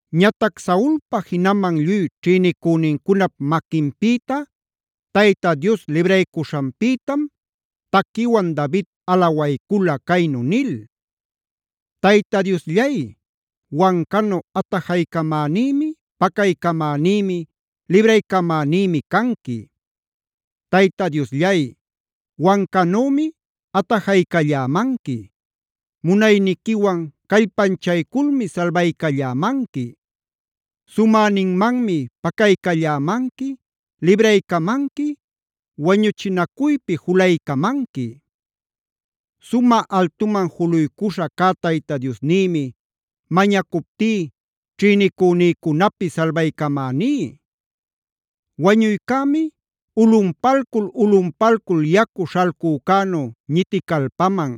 Ñatac Saulpa jinaman lluy ćhïnicünincunap maquinpïta Tayta Dios libraycuśhanpïtam taquiwan David alawaycula, caynu nil: “Tayta Diosllay, wancanu atajaycamänïmi, pacaycamänïmi, libraycamänïmi canqui. Tayta Diosllay, wancanümi atajaycallämanqui. Munayniquiwan callpanchayculmi salbaycallämanqui. Sumäninmanmi pacaycallämanqui, libraycamanqui, wañuchinacuypi julaycamanqui. Sumä altuman juluycuśha cä Tayta Diosnïmi mañacuptí ćhïnicünïcunapi salbaycamäní. “Wañuycämi ulꞌunpalcul-ulꞌunpalcul yacu śhalcücänu ñiticalpaman,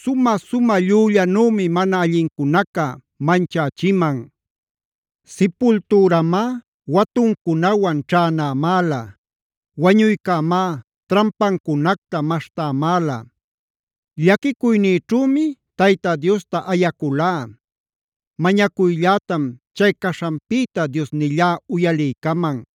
sumä-sumä llüllanümi mana allincunaca manchächiman. Sipultüramá watuncunawan ćhänämäla. Wañuycämá trampancunacta maśhtämäla. Llaquicuynïćhümi Tayta Diosta ayaculá. Mañacuyllätam chay caśhanpïta Diosnillá uyaliycaman.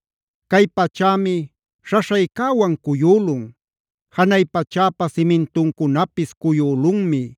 “Cay pachämi śhaśhaycäwan cuyülun. Janay pachäpa simintuncunapis cuyülunmi.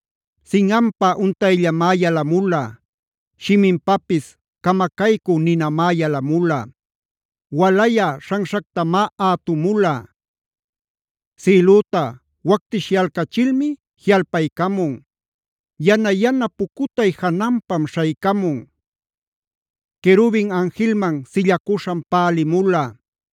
Sinꞌanpa untayllamá yalamula. Shiminpapis camacaycü ninamá yalamula. Walayä śhanśhactamá ätumula. Sïlüta wactishyalcachilmi jiꞌalpaycamun. Yana-yana pucutay jananpam śhaycamun. Querubin anjilman sillacuśham pälimula.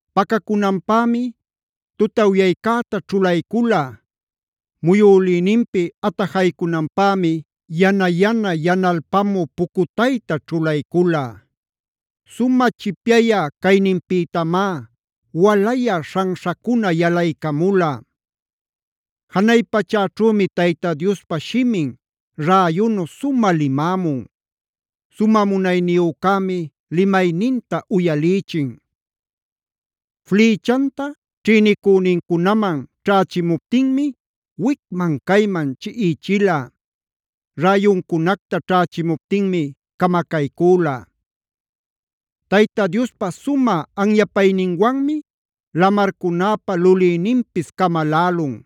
Pacacunanpämi tutawyaycäta ćhulaycula. Muyülïninpi atajaycunanpämi yana-yana yanalpamü pucutayta ćhulaycula. Sumä chipyayä cayninpïtamá walayä śhanśhacuna yalaycamula. “Janay pachäćhümi Tayta Diospa shimin räyunu sumä limämun. Sumä munayniyücämi limayninta uyalïchin. Flïchanta ćhïnicünïcunaman ćhächimuptinmi wicman-cayman chiꞌichila. Räyuncunacta ćhächimuptinmi camacaycüla. Tayta Diospa sumä anyapayninwanmi lamarcunäpa lulïninpis camalälun.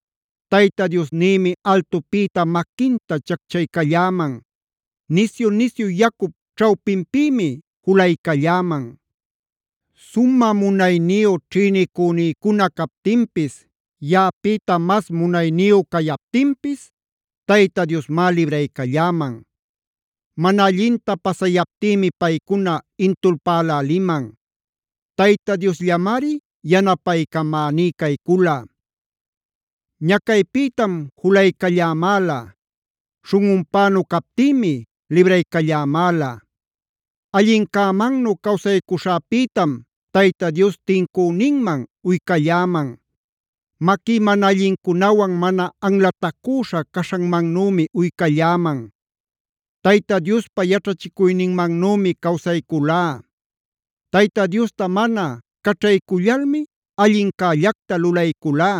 “Tayta Diosnïmi altupïta maquinta chacchaycalläman. Nisyu-nisyu yacup ćhawpinpïmi julaycalläman. Sumä munayniyu ćhïnicünïcuna captinpis, yaꞌapïta mas munayniyu cayaptinpis Tayta Diosmá libraycalläman. Mana allinta pasayaptïmi paycuna intulpäläliman. Tayta Diosllamari yanapaycamäní caycula. Ñacaypïtam julaycallämäla. Śhunꞌunpänu captïmi libraycallämäla. “Allincämannu cawsaycuśhäpïtam Tayta Dios tincüninman uycalläman. Maquí mana allincunawan mana anlatacüśha caśhanmannümi uycalläman. Tayta Diospa yaćhachicuyninmanümi cawsayculá. Tayta Diosta mana caćhaycullalmi allincällacta lulayculá.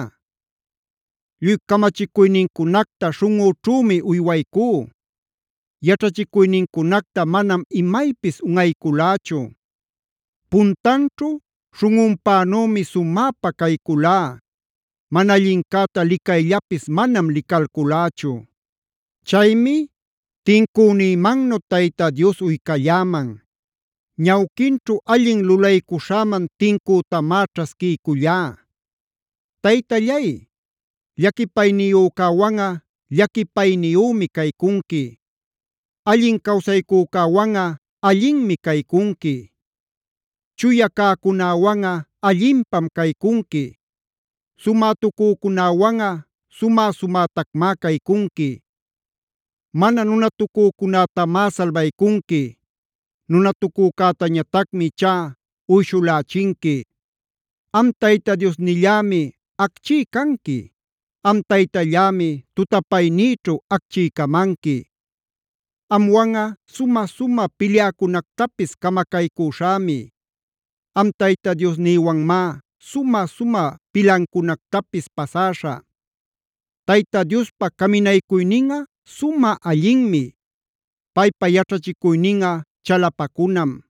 Lluy camachicuynincunacta śhunꞌüćhümi uywaycú. Yaćhachicuynincunacta manam imaypis unꞌayculächu. Puntanćhu śhunꞌunpänümi sumäpa cayculá. Mana allincäta licayllapis manam licalculächu. Chaymi tincünïmannu Tayta Dios uycalläman. Ñawquinćhu allin lulaycuśhäman tincütamá ćhasquiycullá. “Taytallay, llaquipayniyücäwanꞌa llaquipayniyümi caycunqui. Allin cawsaycücäwanꞌa allinmi caycunqui. Chuya cäcunäwanꞌa allinpam caycunqui; sumätucücunäwanꞌa sumä-sumätacmá caycunqui. Mana nunatucücunätamá salbaycunqui. Nunatucücätañatacmi ichá uyshulächinqui. Am Tayta Diosnillämi acchí canqui. Am Taytallämi tutapaynïćhu acchiycamanqui. Amwanꞌa sumä-sumä pilyäcunactapis camacaycüśhämi. Am Tayta Diosnïwanmá sumä-sumä pilancunactapis pasäśhä. “Tayta Diospa caminaycuyninꞌa sumä allinmi. Paypa yaćhachicuyninꞌa chalapacunam.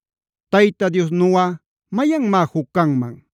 ¿Tayta Diosnuꞌa mayanmá juc canman?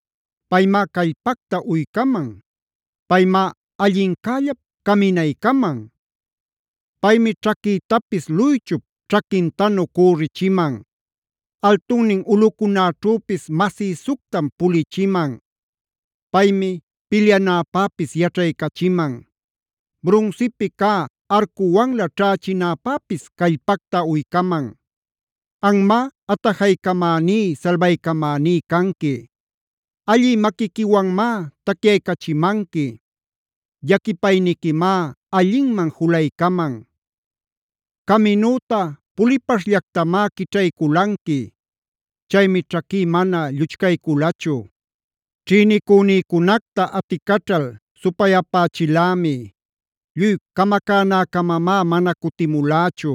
Paymá callpacta uycaman. Paymá allincällap caminaycaman. Paymi ćhaquïtapis luychup ćhaquintanu cürichiman.g Altunnin ulꞌucunäćhüpis masïsuctam pulichiman. Paymi pilyanäpäpis yaćhaycachiman. Brunsipi cä arcuwanlä ćhächinäpäpis callpacta uycaman. Anmá atajaycamäní, salbaycamäní canqui. Allï maquiquiwanmá tacyaycachimanqui. Llaquipayniquimá allinman julaycaman. Caminüta pulipaśhllactamá quićhayculanqui. Chaymi ćhaquí mana lluchcayculachu. “Ćhïnicünïcunacta aticaćhal supay-apächilämi; lluy camacänäcamamá mana cutimulächu.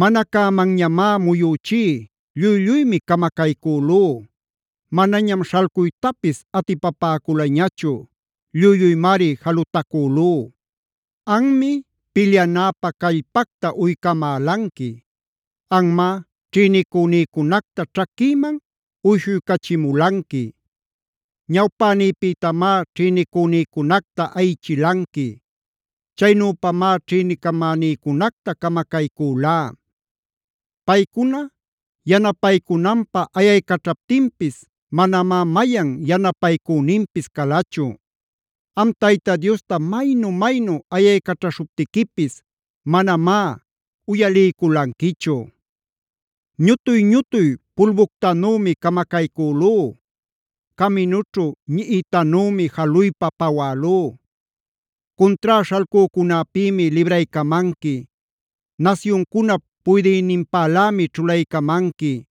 Mana cämanñamá muyüchí, lluy-lluymi camacaycülú. Manañam śhalcuytapis atipapäculañachu; lluy-lluymari jalutacülú. Anmi, pilyanäpä callpacta uycamälanqui. Anmá ćhïnicünïcunacta ćhaquïman uyshuycachimulanqui. Ñawpänïpïtamá ćhïnicünïcunacta ayichilanqui. Chaynüpamá ćhïnicamänïcunacta camacayculá. Paycuna yanapaycunanpä ayaycaćhaptinpis manamá mayan yanapaycüninpis calachu. Am Tayta Diosta maynu-maynu ayaycaćhaśhuptiquipis manamá uyalïculanquichu. Ñutuy-ñutuy pulbuctanümi camacaycülú. Caminućhu ñiꞌitanümá jaluypa pawälú. Cuntrá śhalcücunäpïmi libraycamanqui. Nasyuncunap puydïninpalämi ćhulaycamanqui.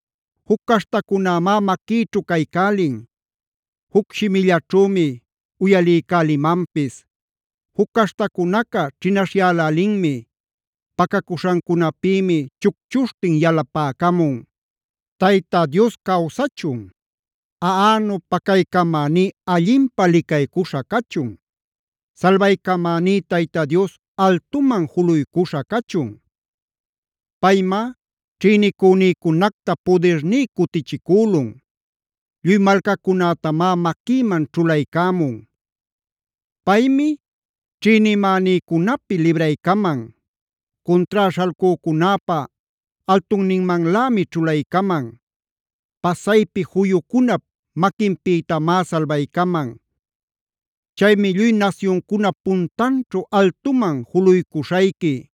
Juc caśhtacunämá maquïćhu caycälin. Juc shimillaćhümi uyaliycälimanpis. Juc caśhtacunaca ćhinaśhyälälinmi. Pacacuśhancunapïmi chucchuśhtin yalapäcamun. “¡Tayta Dios cawsachun! ¡Aꞌanu pacaycamäní allinpä licaycuśha cachun! ¡Salbaycamäní Tayta Dios altuman juluycuśha cachun! Paymá ćhïnicünïcunacta pudirní cutichicülun; lluy malcacunätamá maquïman ćhulaycämun. Paymi ćhïnimänïcunapi libraycaman; cuntrá śhalcücunäpä altunninmanlämi ćhulaycaman. Pasaypi juyucunap maquinpïtamá salbaycaman. Chaymi lluy nasyuncunap puntanćhu altuman juluycuśhayqui;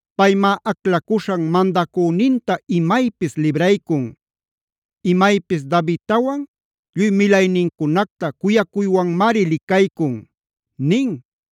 Paymá aclacuśhan mandacüninta imaypis libraycun. Imaypis Davidtawan lluy milaynincunacta cuyacuywanmari licaycun” nin.